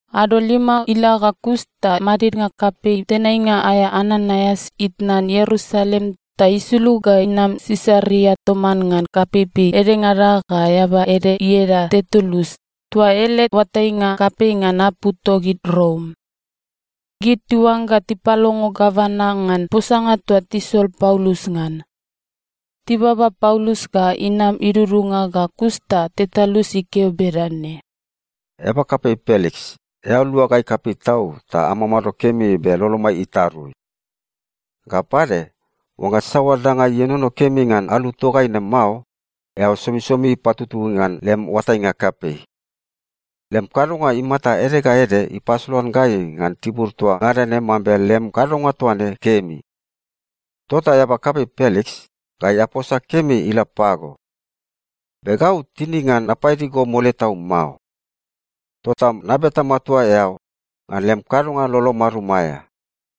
Ado lima ila ga kus ta madidnga kapei tenainga aea Ananaias itnan Ierusalem ta isulug ga inam Sisaria toman ngan kapeipei edengada ga eaba ede ieda Tertulus toa ele oatainga kapei ngan apu togid Rom. Gid tiuangga tipalongo gavana ngan posanga toa tisol Paulus ngan. Tibaba Paulus ga inam idudunga ga kus ta Tertulus ikeo bedane, “Eaba kapei Peliks, eao lua gai kapei tau ta amamado kemi be lolomai itarui. Ga pade, oangga saoa danga ienono kemi ngan alu togai ne mao, eao somisomi patutui ngan lem oatainga kapei. Lem kadonga imata ede ga ede ipasolan gai ngan tibur toa ngada ne mambe lem kadonga toa ne kemi. Tota eaba kapei Peliks, gai aposa kemi ila pago. Be gau tinig ngan napaidi go mole tau mao. Tota nabeta matua eao, ngan lem kadonga lolo marum aea,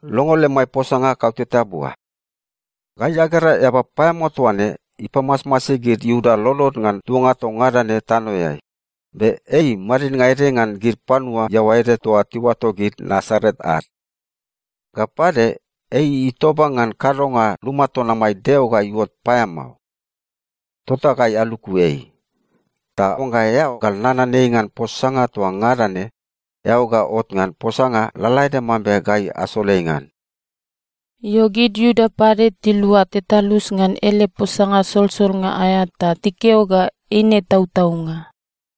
longo lemai posanga kauteta bua. “Gai agera eaba paeamao toa ne ipamasmasi gid Iuda lolod ngan tuanga toa ngada ne tanoeai, be ei madidnga ede ngan gid panua iaoa ede toa tiuato gid Nasaret ad. Ga pade, ei itoba ngan kadonga luma ton amai Deo ga iuot paeamao. Tota gai aluku ei. Ta oangga eao gal nanan ei ngan posanga toa ngada ne, eao ga ot ngan posanga lalaede mambe gai asol ei ngan.” Io, gid Iuda pade tilua Tertulus ngan ele posanga solsolnga aea ta tikeo ga eine tautaunga.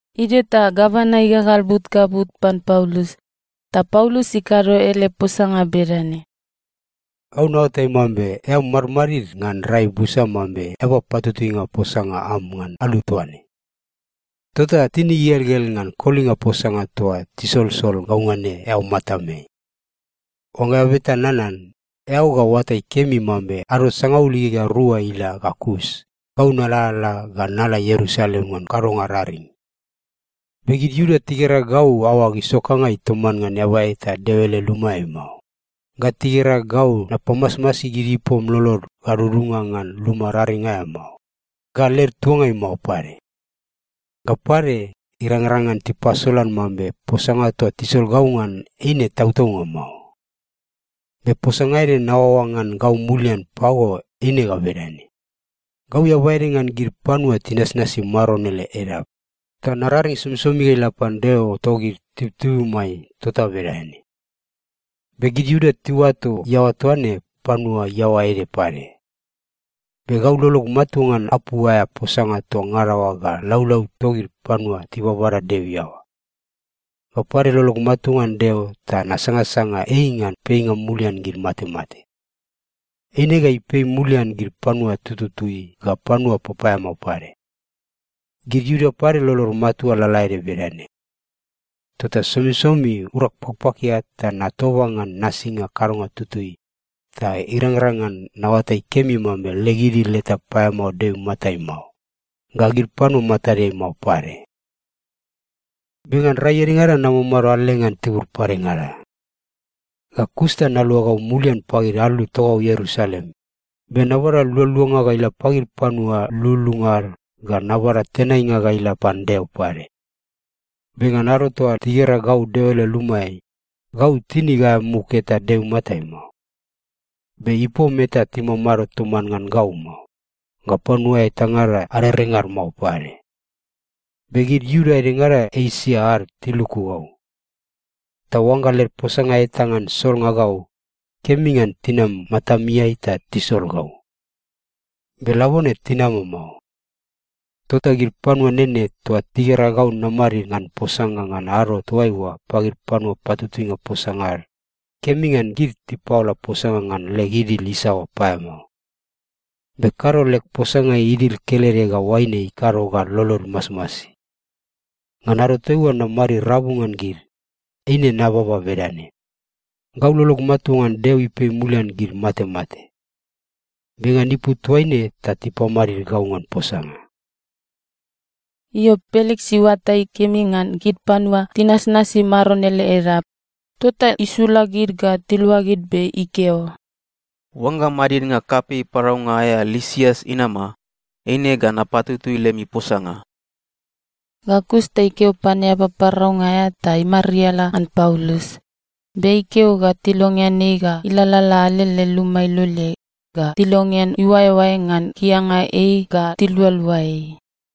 Idio ta gavana igagal but ga but pan Paulus, ta Paulus ikado ele posanga bedane, “Gau naoatai mambe eao madmadid ngan rai busa mambe eaba patutuinga posanga am ngan alu toa ne. Tota tinig igelgel ngan kolinga posanga toa tisolsol gau ngan ne eao matameai. Oangga eao beta nanan, eao ga oatai kemi mambe ado sangaul igegea rua ila ga kus, gau nalalala ga nala Ierusalem ngan kadonga raring. Be gid Iuda tigera gau aoag isokangai toman ngan eaba eta Deo ele lumaeai mao, ga tigera gau napamasmasi gid ipom lolod gadudunga ngan luma raring aea mao, ga led tuangai mao pade. Ga pade, irangrang ngan tipasolan mambe posanga toa tisol gau ngan eine tautaunga mao. Be posanga ede naoaoa ngan gau mulian pago eine ga bedane: Gau eaba ede ngan gid panua tinasnasi Maron ele Edap, ta nararing somisomi ga ila pan Deo togid tibutibumai tota bedane. Be gid Iuda tiuato iaoa toa ne ‘panua iaoa ede pade.’ Be gau lolog matua ngan apu aea posanga toa ngada oa ga laulau togid panua tibabada Deo iaoa. Ga pade, lolog matua ngan Deo ta nasangasanga ei ngan peinga mulian gid matemate. Eine ga ipei mulian gid panua tututui ga panua papaeamao pade. Gid Iuda pade lolod matua lalaede bedane. Tota somisomi urag pakpakia ta natoba ngan nasinga kadonga tutui ta irangrang ngan naoatai kemi mambe leg idil eta paeamao Deo imatai mao, ga gid panua matadeai mao pade. “Be ngan rai edengada namamado alele ngan tibur padengada. Ga kus ta naluagau mulian pagid alu togau Ierusalem, be nabada lualuanga ga ila pagid panua lululunga ad ga nabada tenainga ga ila pan Deo pade. Be ngan ado toa tigera gau Deo ele lumaeai, gau tinig aea muk eta Deo imatai mao. Be ipom eta timamado toman ngan gau mao, ga panua etangada arerengad mao pade. Be gid Iuda edengada Esia ad tiluku gau. Ta oangga led posanga eta ngan solnga gau, kemi ngan tinam matameai ta tisol gau. Be labone tinama mao. Tota gid panua nene toa tigera gau namadid ngan posanga ngan ado toaiua pagid panua patutuinga posanga ad, kemi ngan gid tipaola posanga ngan leg idil isaoa paeamao. Be kado leg posanga idil kelede ga oaine ikado ga lolod imasmasi. Ngan ado toaiua namadid rabu ngan gid, eine nababa bedane, ‘Gau lolog matua ngan Deo ipei mulian gid matemate. Be ngan ipu toaine ta tipamadid gau ngan posanga.’” Io, Peliks iuatai kemi ngan gid panua tinasnasi Maron ele Edap, tota isula gid ga tiluagid be ikeo, “Oangga madidnga kapei paraunga aea Lisias inama, eine ga napatutui lemi posanga.” Ga kus ta ikeo pan eaba paraunga aea ta imariala ngan Paulus, be ikeo ga tilongean ei ga ilalala alele luma iloleai ga tilongean iuaeoae ngan kianga ei ga tilualua ei.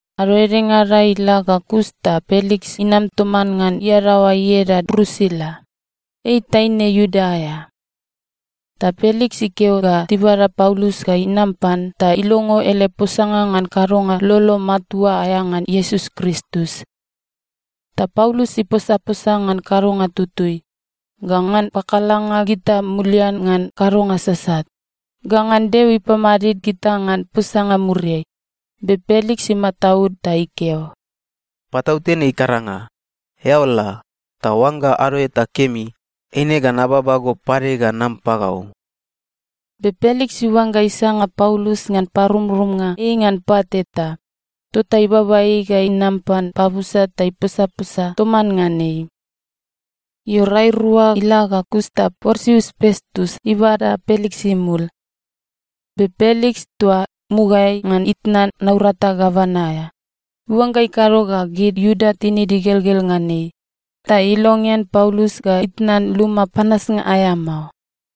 Ado edengada ila ga kus ta Peliks inam toman ngan iadaoa ieda Drusila. Ei taine Iuda aea. Ta Peliks ikeo ga tibada Paulus ga inam pan ta ilongo ele posanga ngan kadonga lolo matua aea ngan Iesus Kristus. Ta Paulus iposaposa ngan kadonga tutui, ga ngan pakalanga gita mulian ngan kadonga sasat, ga ngan Deo ipamadid gita ngan posanga muriai, be Peliks imataud ta ikeo, “Patautene ikaranga. Eao la, ta oangga ado eta kemi, eine ga nababa go pade ga nam pagau.” Be Peliks iuangga isanga Paulus ngan parumrumnga ei ngan pat eta, tota ibaba ei ga inam pan pabusa ta iposaposa toman ngan ei. Io, rai rua ila ga kus ta Porsius Pestus ibada Peliks imul. Be Peliks, toa mugaeai ngan itnan naurata gavana aea, iuangga ikado ga gid Iuda tinid igelgel ngan ei, ta ilongean Paulus ga itnan luma panasnga aea mao.